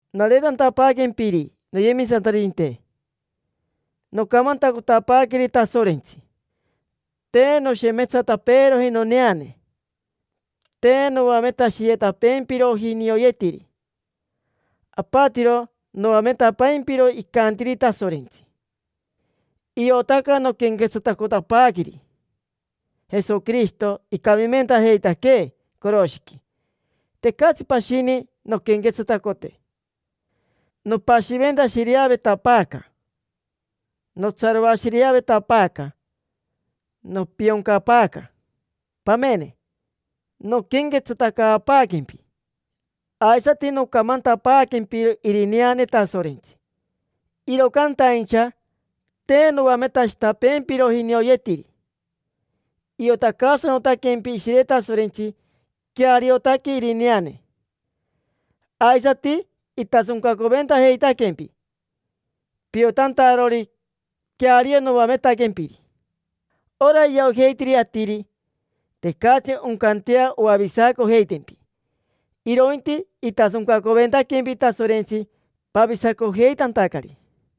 Nareetantapaaquempiri, noyemisantaririnte, nocamantacotapaaqueri Tasorentsi. Te noshemetsatapeeroji noneane, te noametashiyetapeempiroji nioyetiri; apatiro noametapaimpiro icantiri Tasorentsi. Iotaca noquenquetsatacotapaaqueri Jesoquirishito, icamimentajeitaquee coroshiqui. Tecatsi pashini nonquenquetsatacote. Nopashiventashireavetapaaca, notsaroashireavetapaaca, nopioncapaaca. Pamene, noquenquetsatacaapaaquempi aisati nocamantapaaquempiro irineane Tasorentsi, iro cantaincha te noametashitapeempiroji nioyetiri. Iotacaasanotaquempi Ishire Tasorentsi queariotaque irineane, aisati itasoncacoventajeitaquempi piotantarori queario noametaquempiri. Ora iojeitiri atiri, tecatsi oncantea oavisacojeitempi, irointi itasoncacoventaquempi Tasorentsi pavisacojeitantacari.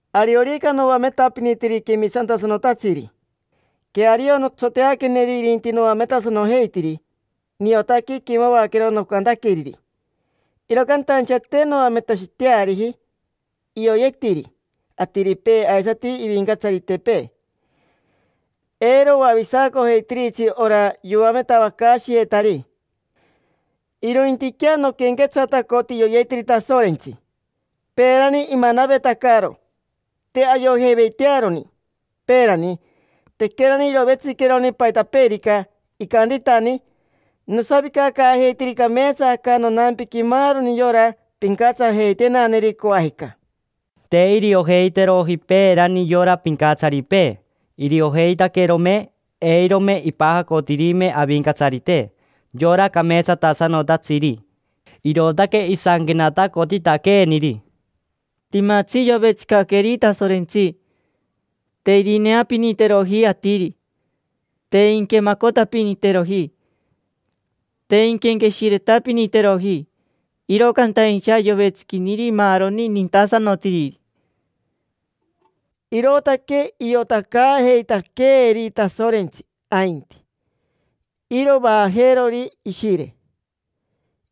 Ariorica noametapinitiri quemisantasanotatsiri, queario notsoteaqueneri irinti noametasanojeitiri, niotaque iquemavaquero nocantaqueriri. Iro cantaincha te noametashiteariji ioyetiri atiripee aisati ivincatsaritepee. Eiro oavisacojeitiritsi ora yoametavacaashiyetari. Irointiquea noquenquetsatacoti ioyetiri Tasorentsi. Peerani imanavetacaro, te ayojeiveitearoni. Peerani, tequerani irovetsiqueroni paitapeerica, icantitani: “Nosavicacaajeiteri cameetsa aca nonampiqui maaroni yora pincatsajeitenaneri, coajica”. Te iriojeiteroji peerani yora pincatsaripee. Iriojeitaquerome, eirome ipajacotirime Avincatsarite, yora cameetsatasanotatsiri. Irootaque isanquenatacotitaqueeniri: “Timatsi yovetsicaqueri Tasorentsi. Te irineapiniteroji atiri, te inquemacotapiniteroji, te inquenqueshiretapiniteroji. Iro cantaincha yovetsiquiniri maaroni nintasanotiriri”. Irootaque iotacaajeitaqueeri Tasorentsi ainti, iro vaajeerori Ishire.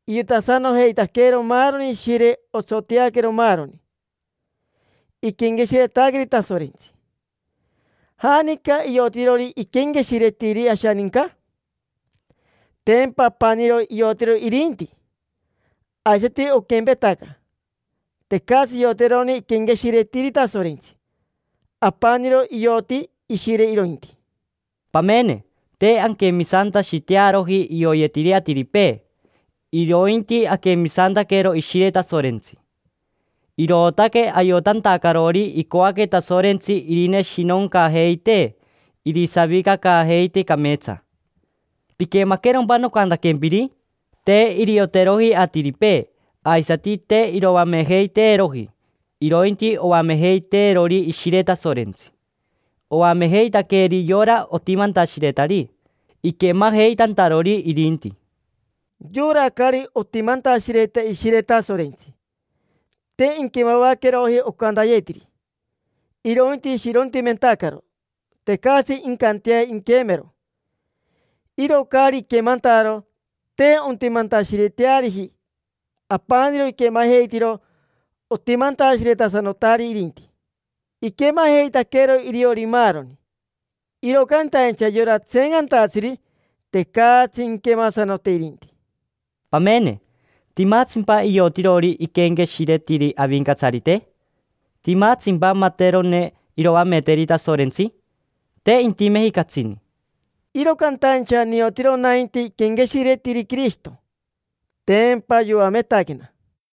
Iotasanojeitaquero maaroni Ishire, otsoteaquero maaroni iquenqueshiretaqueri Tasorentsi. ¿Janica iotirori iquenqueshiretiri ashaninca? Tempa apaniro iotiro irinti. Aisati oquempetaca, tecatsi ioterone iquenqueshiretiri Tasorentsi: apaniro ioti Ishire irointi. Pamene, te anquemisantashitearoji ioyetiri atiripee, irointi aquemisantaquero Ishire Tasorentsi. Irootaque ayotantacarori icoaque Tasorentsi irineshinoncajeitee, irisavicacaajeitee cameetsa. ¿Piquemaquerompa nocantaquempiri? Te irioteroji atiripee, aisati te iroamejeiteeroji, irointi oamejeiteerori Ishire Tasorentsi. Oamejeitaqueri yora otimantashiretari, iquemajeitantarori irinti. Yora caari otimantashireta Ishire Tasorentsi, te inquemavaqueroji ocantayetiri, irointi ishirontimentacaro. Tecatsi incantea inquemero. Iro caari iquemantaro, te ontimantashireteariji. Apaniro iquemajeitiro otimantashiretasanotari, irinti. Iquemajeitaquero iriori maaroni, iro cantaincha yora tseencantatsiri, tecatsi inquemasanote irinti. Pamene, ¿timatsimpa iotirori iquenqueshiretiri Avincatsarite? ¿Timatsimpa materone iroameteri Tasorentsi? Te intimeji catsini. Iro cantaincha niotiro nainti iquenqueshiretiri Quirishito, tempa yoametaquena.